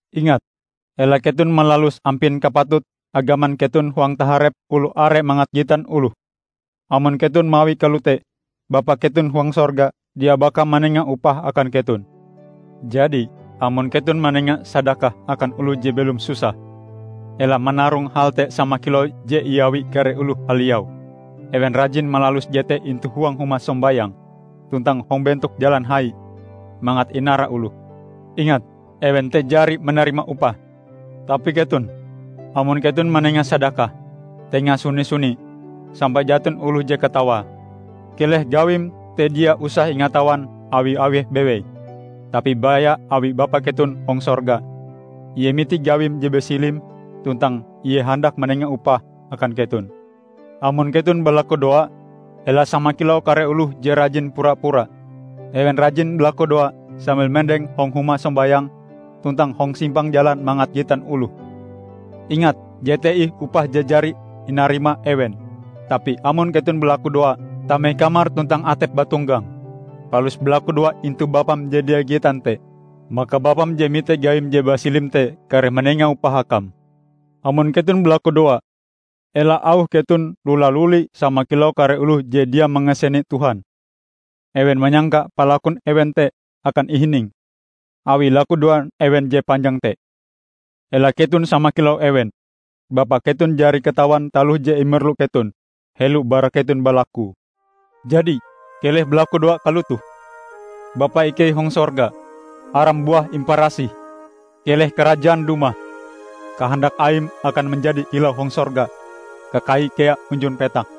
"Ingat, ela keton malalus ampin kapatut agaman keton hong taharep oloh are mangat gitan oloh. Amon keton mawie kalote, Bapa keton huang sorga dia baka manenga upah akan keton. Jadi, amon keton manenga sadakah akan oloh je belom susah, ela manarong hal te sama kilau je iawi kare oloh haliau. Ewen rajin malalus jete intu huang huma sombayang tuntang hong bentok jalan hai, mangat inara oloh. Ingat, ewen te jari manarima upahe. Tapi keton, amon keton manenga sadakah, tenga suni-suni, sampai jaton oloh je katawae. Keleh gawim te dia usah ingatawan awi eweh bewei, tapi baya awi Bapa keton hong sorga. Ie mite gawim je basilim tuntang Ie handak manenga upah akan keton." "Amon keton balakudoa, ela sama kilau kare oloh je rajin pura-pura. Ewen rajin balakudoa sambil mendeng hong huma sombayang tuntang hong simpang jalan mangat gitan oloh. Ingat, jete ih upah je jari inarima ewen. Tapi amon keton balakudoa, tame kamar tuntang atep bauntonggang, palus balakudoa intu Bapam je dia gitan te. Maka Bapam je mite gawim je basilim te kareh manenga upah akam. Amon keton balakudoa, ela auh keton lula-luli sama kilau kare oloh je dia mangasene Tuhan. Ewen manyangka palakun ewen te akan ihining, awi lakudoan ewen je panjang te. Ela keton sama kilau ewen. Bapa keton jari katawan taloh je imerlu keton, helo bara keton balakue. Jadi keleh balakudoa kalotoh, 'Bapa ikei hong sorga: Aram buah imparasih. Keleh Karajaan dumah. Kahandak Aim akan manjadi kilau hong sorga kakai kea hunjun petak.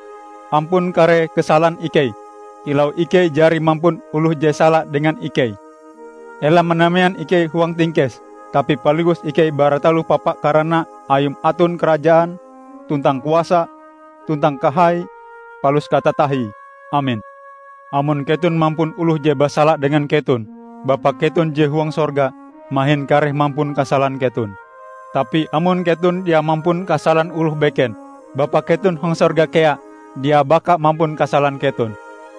Ampun kare kasalan ikei, kilau ikei jari mampun oloh je sala dengan ikei. Ela manamean ikei huang tingkes tapi paliwus ikei bara taloh papa karana Ayum aton karajaan, tuntang kuasa, tuntang kahai palus katatahie, Amen.' Amon keton mampun oloh je basala dengan keton, Bapa keton je huang sorga mahin kareh mampun kasalan keton. Tapi amon keton dia mampun kasalan oloh beken, Bapa keton hong sorga kea dia baka mampun kasalan keton."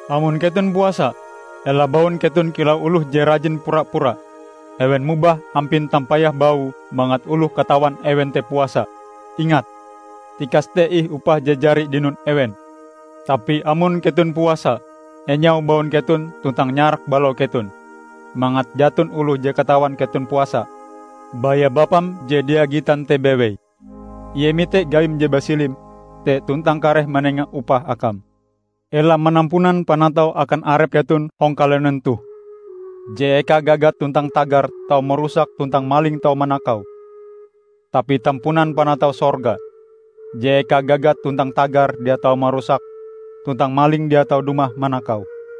"Amon keton puasa, ela baun keton kilau oloh je rajin pura-pura. Ewen mobah ampin tampayah baue mangat oloh katawan ewen te puasa. Ingat, tikas te ih upah je jari dinon ewen. Tapi amon keton puasa, enyau baun keton tuntang nyarak balau keton, mangat jaton oloh je katawan keton puasa, baya Bapam je dia gitan te bewei. Ie mite gawim je basilim te tuntang kareh manenga upah akam." "Ela manampunan panatau akan arep keton hong kalunen toh, je eka gagat tuntang tagar tau marusake tuntang maling tau manakaue. Tapi tampunan panatau sorga, je eka gagat tuntang tagar dia tau marusake, tuntang maling dia tau dumah manakaue.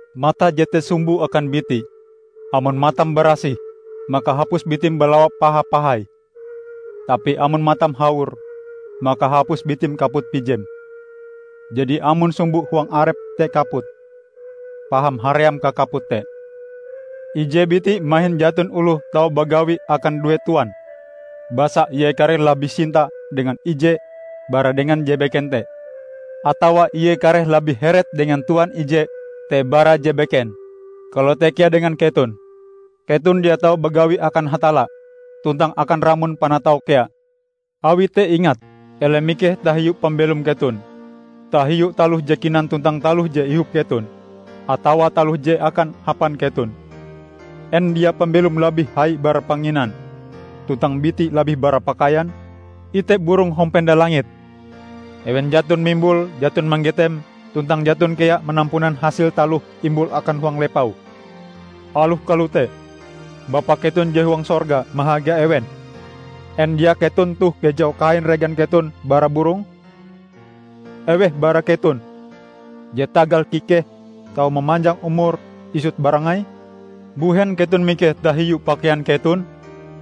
"Mate jete sumbo akan biti. Amon matam barasih, maka hapus bitim balawa paha-pahai. Tapi amon matam hawor, maka hapus bitim kaput pijem. Jadi amon sumbo huang arepm te kaput, paham haream kakaput te!" "Ije biti mahin jaton oloh tau bagawi akan due tuan. Basa ie kareh labih sinta dengan ije bara dengan je beken te. Atawa ie kareh labih heret dengan tuan ije te bara je beken. Kalote kea dengan keton. Keton dia tau bagawi akan Hatalla tuntang akan ramon panatau kea. Awi te ingat; ela mikeh tahiu pambelom keton, tahiu taloh je kinan tuntang taloh je ihop keton, atawa taloh je akan hapan keton. En dia pambelom labih hai bara panginan, tuntang biti labih bara pakaian? Ite burong hong penda langit. Ewen jaton mimbul, jaton manggetem, tuntang jaton kea manampunan hasil taloh imbule akan huang lepau. Aloh kalote, Bapa keton je huang sorga mahaga ewen! En dia keton toh kejau kahain regan keton bara burong? Eweh bara keton je tagal kikehe tau mamanjang umure isut barangai? Mbuhen keton mikeh tahiu pakaian keton?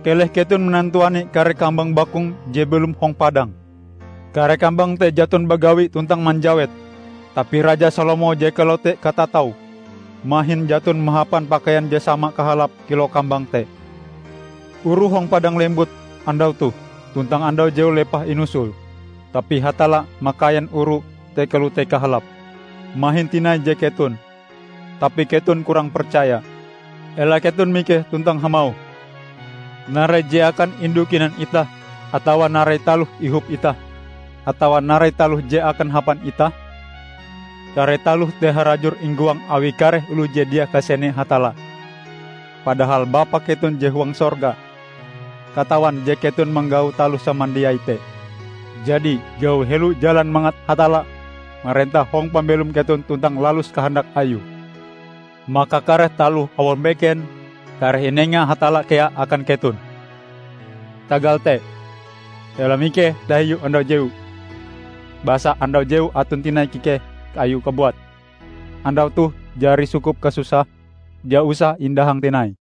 Keleh keton manantuani kare kambang bakung je belom hong padang. Kare kambang te jaton bagawi tuntang manjawet; Tapi Raja Salomo je kalote katataue mahin jaton mahapan pakaian je sama kahalape kilau kambang te! Oru hong padang lembut andau toh tuntang andau jewu lepah inusul. Tapi Hatalla makaian oru te kalote kahalape. Mahin tinai je keton! Tapi keton kurang percaya! Ela keton mikeh tuntang hamauh, 'Narai je akan indu kinan itah' atawa 'narai taloh ihop itah', atawa 'narai taloh je akan hapan itah'? Kare taloh te harajur inggoang awi kare oloh je dia kasene Hatalla. Padahal Bapa keton je huang sorga katawan je keton manggau taloh samandiai te. Jadi, gau helo jalan mangat Hatalla marentah hong pambelom keton tuntang lalus kahandak Ayue. Maka kare taloh awang beken kareh inenga Hatalla kea akan keton. Tagal te, ela mikeh tahiu andau jewu. Basa andau jewu aton tinai kikeh ayue kabuat. Andau toh jari sukup kasusahe, dia usah indahang tinai."